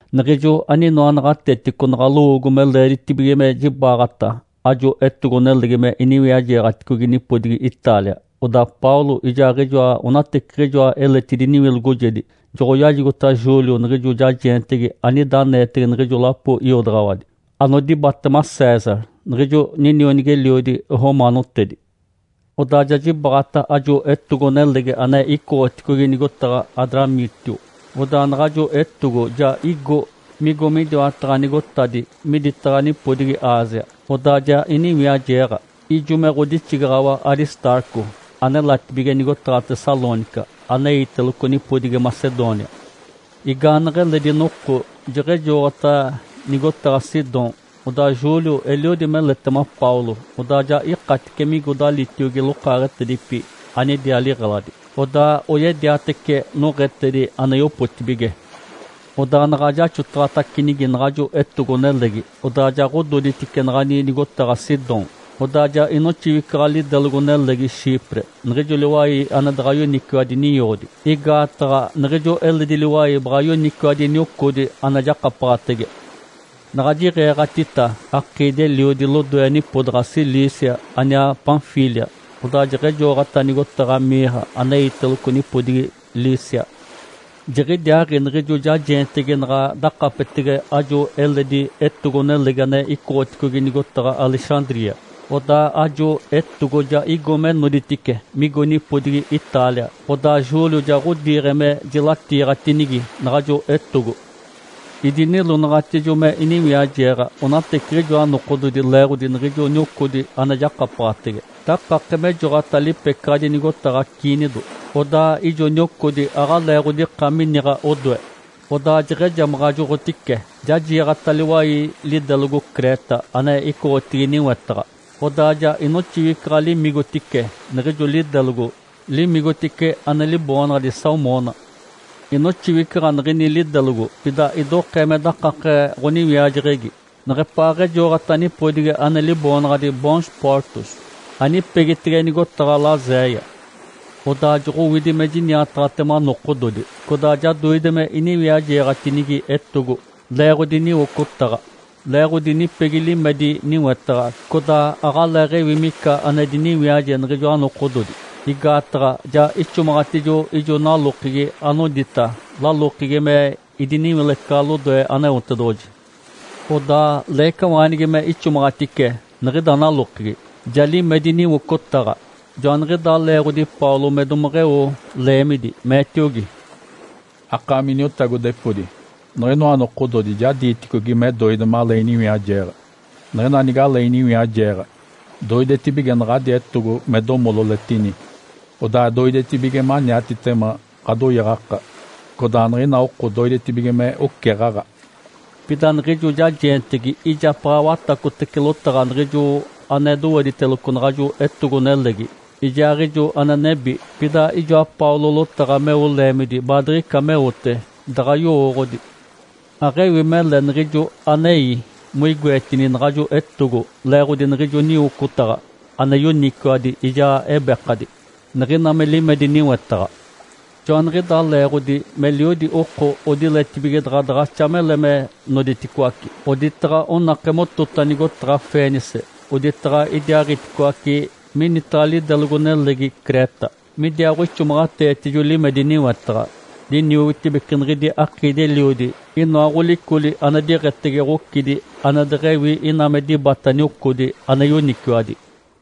Niɡ̶ijo aninoa naɡ̶atetico naɡ̶a lowoogo me leeditibige me jibaɡ̶ata ajo etogo-nelegi me iniwiajeeɡ̶aticogi nipodigi Itália, odaa Paulo ijaaɡ̶ijoa onateciɡ̶ijoa eletidi niwilogojedi joɡ̶oyajigota Júlio niɡ̶ijo jajeentegi anida aneetege niɡ̶ijo lapo iodaɡ̶awadi anodibatema César, niɡ̶ijo ninionigi-eliodi romaanotedi. Odaa ja jibaɡ̶ata ajo etogo-nelegi ane icoɡ̶oticogi nigotaɡ̶a Adramítio. Odaa naɡ̶ajo etogo ja igo migo midiwataɡ̶a nigotadi miditaɡ̶a nipodigi Ásia, odaa ja iniwiajeeɡ̶a. Ijo me ɡ̶odixigaɡ̶awa Aristarco anelatibige nigotaɡ̶a Tessalônica aneiteloco nipodigi Macedônia. Igaaneɡ̶eledi noko jeɡ̶ejoɡ̶ota nigotaɡ̶a Sidom. Odaa Júlio eliodi meletema Paulo, odaa ja ikatice migo dalitiogi lokaaɡ̶etedipi anidiaa liɡ̶eladi, odaa oyediatece noɡ̶etedi ane yopotibige. Odaa naɡ̶a jaxotaɡ̶atacinigi naɡ̶ajo etogo-nelegi, odaa ja ɡ̶ododitice naɡ̶ani nigotaɡ̶a Sidom. Odaa ja inoxiwicaɡ̶a lidelogo-nelegi Chipre, niɡ̶ijo liwai ane daɡ̶a yoniciwadi niocodi, igaataɡ̶a niɡ̶ijo eledi liwai baɡ̶a yoniciwadi niocodi ane jakapaɡ̶atege. Naɡ̶a jiɡ̶eeɡ̶atita akiidi-eliodi lodoe nipodaɡ̶a Cilícia aniaa Panfília, odaa jeɡ̶ejoɡ̶ota nigotaɡ̶a Mirra aneiteloco nipodigi Lícia. Jiɡ̶idiaaɡ̶i niɡ̶ijo jajeentegi naɡ̶a dakapetege ajo eledi etogo-nelegi ane icoɡ̶oticogi nigotaɡ̶a Alexandria. Odaa ajo etogo ja igo me noditice, migo nipodigi Itália, odaa Júlio ja ɡ̶odiiɡ̶e me jilatiiɡ̶atinigi naɡ̶ajo etogo. Idinilonaɡ̶atijo me iniwiajeeɡ̶a onateciɡ̶ijoa nokododi leeɡ̶odi niɡ̶ijo niocodi ane jakapaɡ̶atege. Dakake mejoɡ̶ota lipecaɡ̶adi nigotaɡ̶a Cnido. Odaa ijo niocodi aɡ̶alee ɡ̶odika miniɡ̶a odoe, Odaa jeɡ̶ejamaɡ̶ajoɡ̶otice, ja jiiɡ̶ata liwai lidelogo Creta ane icoɡ̶otigi niwetaɡ̶a. Odaa ja inoxiwicaɡ̶a limigotice niɡ̶ijo lidelogo, limigotice ane liboonaɡ̶adi Salmona. Inoxiwicaɡ̶a niɡ̶ini lidelogo, pida idokee me dakake ɡ̶oniwiajeɡ̶egi neɡ̶epaaɡ̶ejoɡ̶ota nipodigi ane liboonaɡ̶adi Bons Portos, anipegitege nigotaɡ̶a Laséia. Odaa joɡ̶owidi me jiniataɡ̶atema nokododi, codaa ja doide me iniwiajeeɡ̶atinigi etogo leeɡ̶odi niwocotaɡ̶a. Leeɡ̶odi nipegi limedi niwetaɡ̶a (codaa aɡ̶aleeɡ̶ewi mica ane diniwiaje niɡ̶ijoa nokododi) igaataɡ̶a ja ixomaɡ̶atijo ijo nalokegi anodita “Lalokegi me idiniwilecaɡ̶a lodoe Aneotedoɡ̶oji.”. (Odaa leecawaanigi me ixomaɡ̶atice niɡ̶ida nalokegi, ja limedi niwocotaɡ̶a.) Joaniɡ̶idaa leeɡ̶odi Paulo me domeɡ̶eo leemidi, meetiogi, “Akaami iniotagodepodi, niɡ̶inoa nokododi ja diiticogi me doide malee iniwiajeeɡ̶a. Niɡ̶ina nigalee iniwiajeeɡ̶a, doidetibige naɡ̶adi etogo me domololetini, odaa doidetibige maniatitema ɡ̶adoyaɡ̶aka codaa niɡ̶ina oko doidetibige me oceɡ̶aɡ̶a.” Pida niɡ̶ijo jajeentegi ijapaɡ̶a watacotece lotaɡ̶a niɡ̶ijo ane dowediteloco naɡ̶ajo etogo-nelegi ijaaɡ̶ijo ane nebi, pida ijoa Paulo lotaɡ̶a meo leemidi baadiɡ̶ica meote daɡ̶a yowooɡ̶odi. Aɡ̶ewi mele niɡ̶ijo anei moigoetini naɡ̶ajo etogo leeɡ̶odi niɡ̶ijo niwocotaɡ̶a ane yoniciwadi ijaa ebekadi, niɡ̶ina me limedi niwetaɡ̶a. Joaniɡ̶idaa leeɡ̶odi meliodi oko odiletibige daɡ̶a daɡ̶axa mele me noditicoaci, oditaɡ̶a onake motota nigotaɡ̶a Fenice oditaɡ̶a idiaaɡ̶iticoaci minitaɡ̶a lidelogo-nelegi Creta midiaaɡ̶oixomaɡ̶ateetijo limedi niwetaɡ̶a. Liniogotibece niɡ̶idi akiidi-eliodi inoa ɡ̶olicoli ane diɡ̶etege ɡ̶ocidi ane deɡ̶ewi ina me dibata niocodi ane yoniciwadi.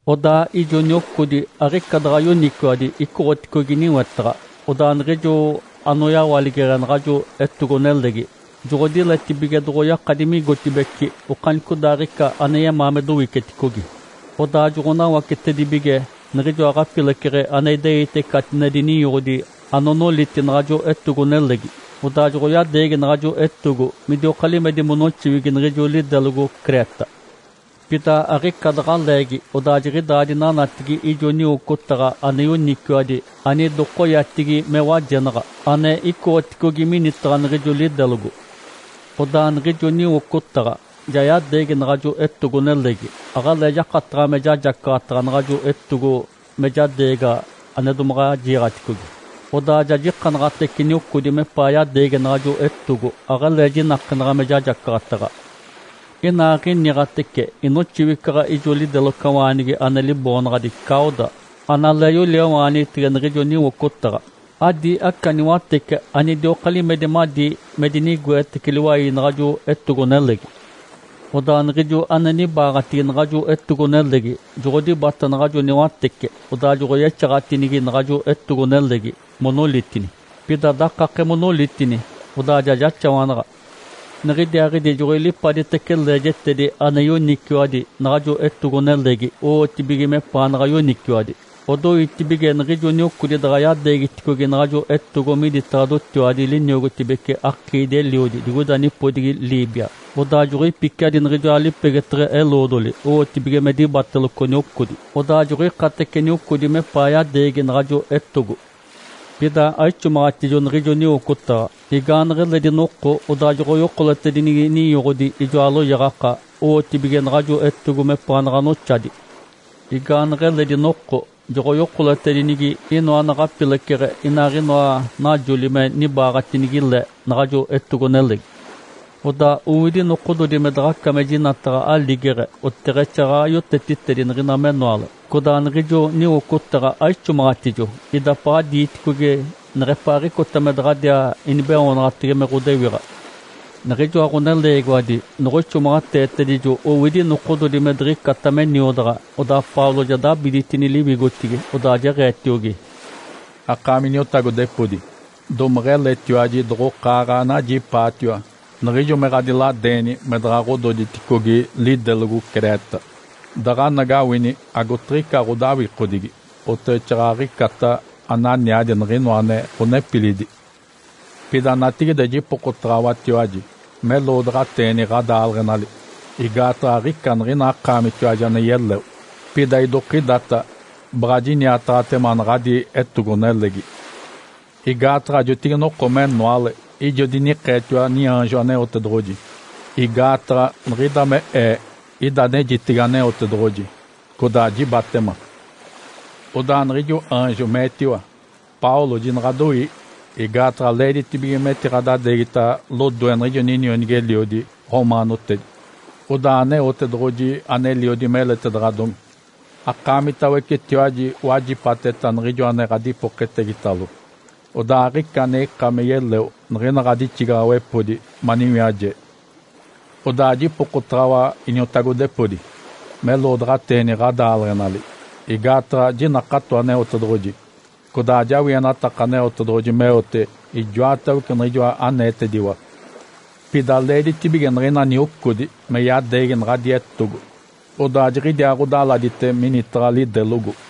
Odaa ijo niocodi aɡ̶ica daɡ̶a yoniciwadi icoɡ̶oticogi niwetaɡ̶a. Odaa niɡ̶ijo anoyawaligeɡ̶e naɡ̶ajo etogo-nelegi joɡ̶odiletibige doɡ̶oyakadi migotibeci okanicodaaɡ̶ica ane yemaa me dowiceticogi. Odaa joɡ̶onawacetedibige niɡ̶ijoa ɡ̶apileceɡ̶e ane ideite catinedi ninyoɡ̶odi anonoliti naɡ̶ajo etogo-nelegi. Odaa joɡ̶oyadeegi naɡ̶ajo etogo midioka limedi monoxiwigi niɡ̶ijo lidelogo Creta. Pida aɡ̶ica daɡ̶a leegi odaa jiɡ̶idaa dinanatigi ijo niwocotaɡ̶a ane yoniciwadi anidokoyatigi me “Wajenaɡ̶a” ane icoɡ̶oticogi minitaɡ̶a niɡ̶ijo lidelogo. Odaa niɡ̶ijo niwocotaɡ̶a ja yadeegi naɡ̶ajo etogo-nelegi, aɡ̶alee jakataɡ̶a me jajacaɡ̶ataɡ̶a naɡ̶ajo etogo me jadeegaɡ̶a ane domaɡ̶a jiiɡ̶aticogi. Odaa ja jikanaɡ̶atece niocodi mepaa yadeegi naɡ̶ajo etogo aɡ̶alee jinakenaɡ̶a me jajacaɡ̶ataɡ̶a. Inaaɡ̶iniɡ̶atece inoxiwicaɡ̶a ijo lidelocawaanigi ane liboonaɡ̶adi Cauda analee yoliawaanigitege niɡ̶ijo niwocotaɡ̶a. Adi aca niwatece anidioka limedi madi me dinigoetece liwai naɡ̶ajo etogo-nelegi. Odaa niɡ̶ijo ane nibaaɡ̶atigi naɡ̶ajo etogo-nelegi joɡ̶odibata naɡ̶ajo niwatece. Odaa joɡ̶oyexaɡ̶atinigi naɡ̶ajo etogo-nelegi monolitini. Pida dakake monolitini, odaa ja jaxawanaɡ̶a. Niɡ̶idiaaɡ̶idi joɡ̶oilipaditece leejetedi ane yoniciwadi naɡ̶ajo etogo-nelegi owotibige mepaanaɡ̶a yoniciwadi. Odoitibige niɡ̶ijo niocodi daɡ̶a yadeegiticogi naɡ̶ajo etogo miditaɡ̶a dotiwadi liniogotibece akiidi-eliodi digoida nipodigi Líbia. Odaa joɡ̶oipiciadi niɡ̶ijoa lipegeteɡ̶e eloodoli owotibige me dibateloco niocodi, odaa joɡ̶oikatece niocodi mepaa yadeegi naɡ̶ajo etogo. Pida aixomaɡ̶atijo niɡ̶ijo niwocotaɡ̶a, igaaneɡ̶eledi noko odaa joɡ̶oyokoletedinigi ninyoɡ̶odi ijoa loyaɡ̶aka owotibige naɡ̶ajo etogo mepaanaɡ̶a noxadi. Igaaneɡ̶eledi noko joɡ̶oyokoletedinigi inoa naɡ̶apileceɡ̶e inaaɡ̶inoa najoli me dibaaɡ̶atinigi le naɡ̶ajo etogo-nelegi. Odaa owidi nokododi me daɡ̶aca me jinataɡ̶a aligeɡ̶e oteɡ̶exaaɡ̶aɡ̶a yotetitedi niɡ̶ina menoale. Codaa niɡ̶ijo niwocotaɡ̶a aixomaɡ̶atijo idapaɡ̶a diiticogi neɡ̶epaaɡ̶icota me daɡ̶adiaa inibeoonaɡ̶atege me ɡ̶odewiɡ̶a. Niɡ̶ijoa ɡ̶oneleegiwadi noɡ̶oixomaɡ̶ateetedijo owidi nokododi me diɡ̶icata me niodaɡ̶a, odaa Paulo ja dabiditini liwigotigi, odaa jeɡ̶eetiogi, “Akaami iniotagodepodi, domeɡ̶eletiwaji doɡ̶okaaɡ̶a anajipaatiwa niɡ̶ijo me ɡ̶adiladeeni me daɡ̶a ɡ̶ododiticogi lidelogo Creta. Daɡ̶anagawini agotiɡ̶ica ɡ̶odawikodigi oteɡ̶exaaɡ̶aɡ̶icata ananiadi niɡ̶inoa ane ɡ̶onepilidi. Pida natigide jipokotaɡ̶awatiwaji meloodaɡ̶ateeni ɡ̶adaaleɡ̶enali. Igaataɡ̶a aɡ̶ica niɡ̶ina akaamitiwaji ane yeleo. Pida idokidata baɡ̶a jiniataɡ̶atema naɡ̶adi etogo-nelegi. Igaataɡ̶a jotigi-noko menoale ijo dinikeetiwa niaanjo Aneotedoɡ̶oji. Igaataɡ̶a niɡ̶ida me ee ida anejitege Aneotedoɡ̶oji codaa jibatema. Odaa niɡ̶ijo aanjo meetiwa, ‘Paulo, jinaɡ̶adoii! Igaataɡ̶a leeditibige metiɡ̶adadeegita lodoe niɡ̶ijo ninionigi-eliodi romaanotedi. Odaa Aneotedoɡ̶oji aneliodi meletedaɡ̶adomi akaamitawecetiwaji wajipateta niɡ̶ijo ane ɡ̶adipoketegitalo, odaa aɡ̶ica ane ika me yeleo niɡ̶ina ɡ̶adixigaɡ̶awepodi maniwiaje.’ Odaa jipokotaɡ̶awa, iniotagodepodi, meloodaɡ̶ateeni ɡ̶adaaleɡ̶enali! Igaataɡ̶a jinakato Aneotedoɡ̶oji, codaa ajawienataka Aneotedoɡ̶oji meote ijoatawece niɡ̶ijoa aneetediwa. Pida leeditibige niɡ̶ina niocodi me yadeegi naɡ̶adi etogo, odaa jiɡ̶idiaaɡ̶odaladite minitaɡ̶a lidelogo.”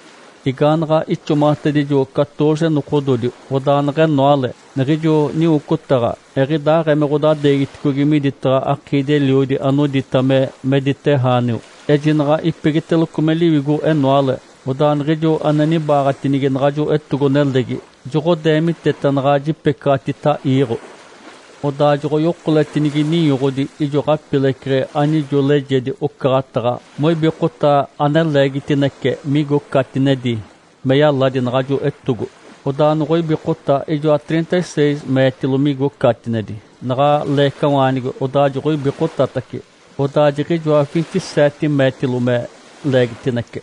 Igaanaɡ̶a ixomaɡ̶atedijo catooze nokododi, odaa neɡ̶enoale, niɡ̶ijo niwocotaɡ̶a eɡ̶idaaɡ̶ee me ɡ̶odadeegiticogi miditaɡ̶a akiidi-eliodi anodita me Mediterrâneo. Ejinaɡ̶a ipegiteloco me liwigo-enoale, odaa niɡ̶ijo ane nibaaɡ̶atinigi naɡ̶ajo etogo-nelegi joɡ̶odeemiteta naɡ̶a jipecaɡ̶atita iiɡ̶o. Odaa joɡ̶oyokoletinigi ninyoɡ̶odi ijo ɡ̶apileceɡ̶e anijo leejedi ocaɡ̶ataɡ̶a moibikota ane leegitinece migo catinedi me yaladi naɡ̶ajo etogo. Odaa noɡ̶oibikota ijoa trinta-seis meetilo migo catinedi. Naɡ̶a leecawaanigi, odaa joɡ̶oibikotatace, odaa jiɡ̶ijoa vinte-seete meetilo me leegitinece.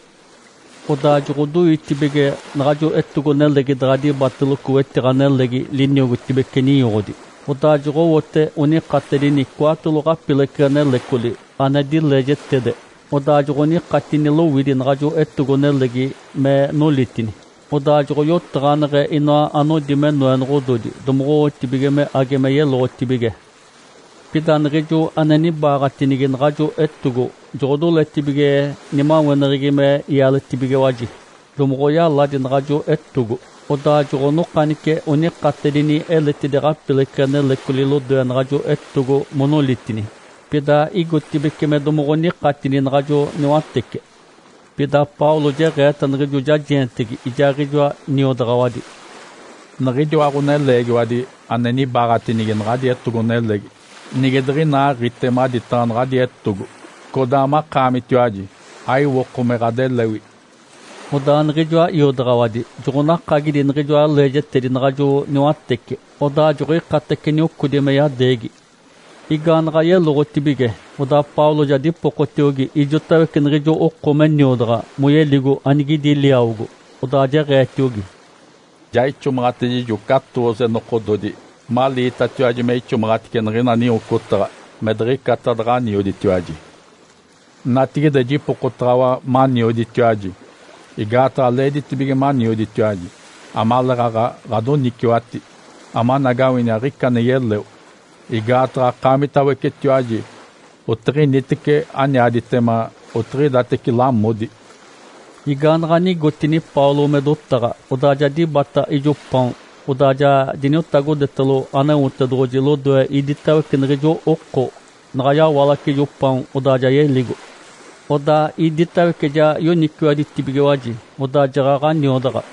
Odaa joɡ̶odoitibige naɡ̶ajo etogo-nelegi daɡ̶a dibateloco wetiɡ̶a nelegi liniogotibece ninyoɡ̶odi. Odaa joɡ̶owote onikatedini cwaatolo ɡ̶apileceɡ̶e nelecoli ane dileejetede, odaa joɡ̶onikatini lowidi naɡ̶ajo etogo-nelegi me nolitini. Odaa joɡ̶oyotaɡ̶aneɡ̶e inoa anodi me noenoɡ̶ododi domoɡ̶owotibige me age me yeloɡ̶otibige. Pida niɡ̶ijo ane nibaaɡ̶atinigi naɡ̶ajo etogo joɡ̶odoletibige nimaweneɡ̶egi me ialetibigiwaji, domoɡ̶oyaladi naɡ̶ajo etogo. Odaa joɡ̶onokanice onikatedini eletidi ɡ̶apileceɡ̶e nelecoli lodoe naɡ̶ajo etogo monolitini. Pida igotibeci me domoɡ̶onikatini naɡ̶ajo niwatece. Pida Paulo jeɡ̶eeta niɡ̶ijo jajeentegi ijaaɡ̶ijoa niodaɡ̶awadi, “Niɡ̶idiwa ɡ̶oneleegiwadi ane nibaaɡ̶atinigi naɡ̶adi etogo-nelegi nige diɡ̶inaaɡ̶ite maditaɡ̶a naɡ̶adi etogo, codaa makaamitiwaji aiwoko me ɡ̶adelewi.” Odaa niɡ̶ijoa iodaɡ̶awadi joɡ̶onakagidi niɡ̶ijoa leejetedi naɡ̶ajo niwatece, odaa joɡ̶oikatece niocodi me yadeegi. Igaanaɡ̶a yeloɡ̶otibige odaa Paulo ja dipokotiogi ijotawece niɡ̶ijo oko me niodaɡ̶a, moyeligo anigidi liawogo, odaa jeɡ̶eetiogi, “Ja ixomaɡ̶atedijo catooze nokododi maliitatiwaji me ixomaɡ̶atice niɡ̶ina niwocotaɡ̶a me diɡ̶icata daɡ̶anioditiwaji. Natigide, jipokotaɡ̶awa manioditiwaji. Igaataɡ̶a leeditibige manioditiwaji amaleeɡ̶aɡ̶a ɡ̶adoniciwati, amanagawini aɡ̶ica ane yeleo. Igaataɡ̶a akaamitawecetiwaji otiɡ̶initece ananiaditema otiɡ̶idatece lamodi.” Igaanaɡ̶a nigotini Paulo me dotaɡ̶a, odaa ja dibata ijo paon, odaa ja diniotagodetalo Aneotedoɡ̶oji lodoe iditawece niɡ̶ijo oko. Naɡ̶a yawalace ijo paon, odaa ja yeligo. Odaa iditawece ja yoniciwaditacibigiwaji, odaa jaɡ̶aɡ̶a niodaɡ̶a.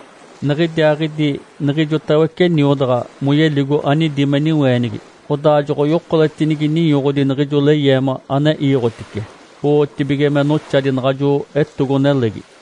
Niɡ̶idiaaɡ̶idi niɡ̶ijotawece niodaɡ̶a, moyeligo anidi me niweenigi, odaa joɡ̶oyokoletinigi ninyoɡ̶odi niɡ̶ijo leyeema ane iiɡ̶otice, owotibige me noxadi naɡ̶ajo etogo-nelegi.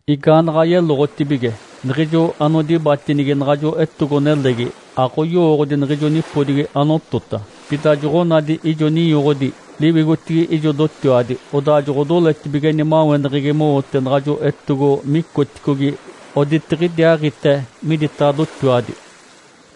Igaanaɡ̶a yeloɡ̶otibige, niɡ̶ijo anodibatinigi naɡ̶ajo etogo-nelegi aɡ̶oyowooɡ̶odi niɡ̶ijo nipodigi anotota. Pida joɡ̶onadi ijo ninyoɡ̶odi liwigotigi ijo dotiwadi, odaa joɡ̶odoletibige nimaweneɡ̶egi mowote naɡ̶ajo etogo micoticogi oditiɡ̶idiaaɡ̶ite miditaɡ̶a dotiwadi.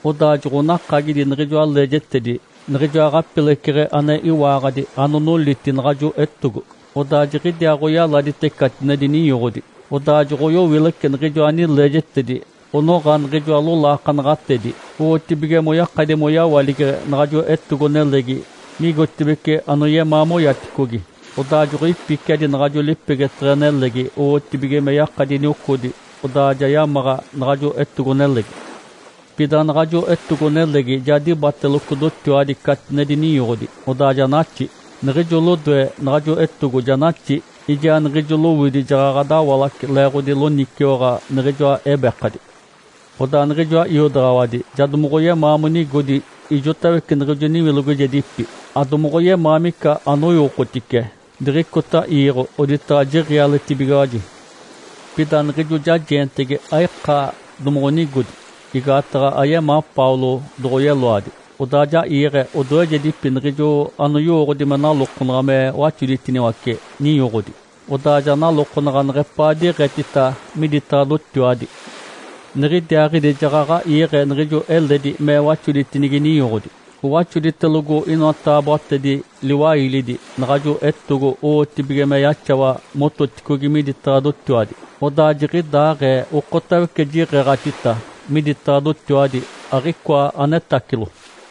Odaa joɡ̶onakagidi niɡ̶ijoa leejetedi niɡ̶ijoa ɡ̶apileceɡ̶e ane iwaaɡ̶adi anonoliti naɡ̶ajo etogo, odaa jiɡ̶idiaaɡ̶oyaladite catinedi ninyoɡ̶odi. Odaa joɡ̶oyowilece niɡ̶ijoa nileejetedi onoɡ̶a niɡ̶ijoa lolaakanaɡ̶atedi, owotibige moyakadi moyawaligeɡ̶e naɡ̶ajo etogo-nelegi migotibeci anoyemaa moyaticogi. Odaa joɡ̶oipiciadi naɡ̶ajo lipegeteɡ̶e nelegi owotibige me yakadi niocodi odaa ja yamaɡ̶a naɡ̶ajo etogo-nelegi. Pida naɡ̶ajo etogo-nelegi ja dibateloco dotiwadi catinedi ninyoɡ̶odi, odaa ja naxi. Niɡ̶ijo lodoe naɡ̶ajo etogo ja naxi, ijaa niɡ̶ijo lowidi jaɡ̶aɡ̶a dawalace leeɡ̶odi loniciwaɡ̶a niɡ̶ijoa ebekadi. Odaa niɡ̶ijoa iodaɡ̶awadi ja domoɡ̶oyemaa monigodi ijotawece niɡ̶ijo niwilogojedipi, adomoɡ̶oyemaa mica anoiwokotice diɡ̶icota iiɡ̶o oditaɡ̶a jiɡ̶ialetibigiwaji. Pida niɡ̶ijo jajeentegi aika doɡ̶onigodi, igaataɡ̶a ayemaa Paulo doɡ̶oyeloadi. Odaa ja iiɡ̶e odoejedipi niɡ̶ijo anoyowooɡ̶odi me nalokonaɡ̶a me waxoditiniwace ninyoɡ̶odi, odaa ja nalokonaɡ̶a neɡ̶epaa diɡ̶etita miditaɡ̶a dotiwadi. Niɡ̶idiaaɡ̶idi jaɡ̶aɡ̶a iiɡ̶e niɡ̶ijo eledi me waxoditinigi ninyoɡ̶odi, owaxoditelogo inoa taaboatedi liwailidi naɡ̶ajo etogo owotibige me yaxawa mototicogi miditaɡ̶a dotiwadi, odaa jiɡ̶idaaɡ̶ee okotawece jiɡ̶eeɡ̶atita miditaɡ̶a dotiwadi, aɡ̶icoa anetacilo.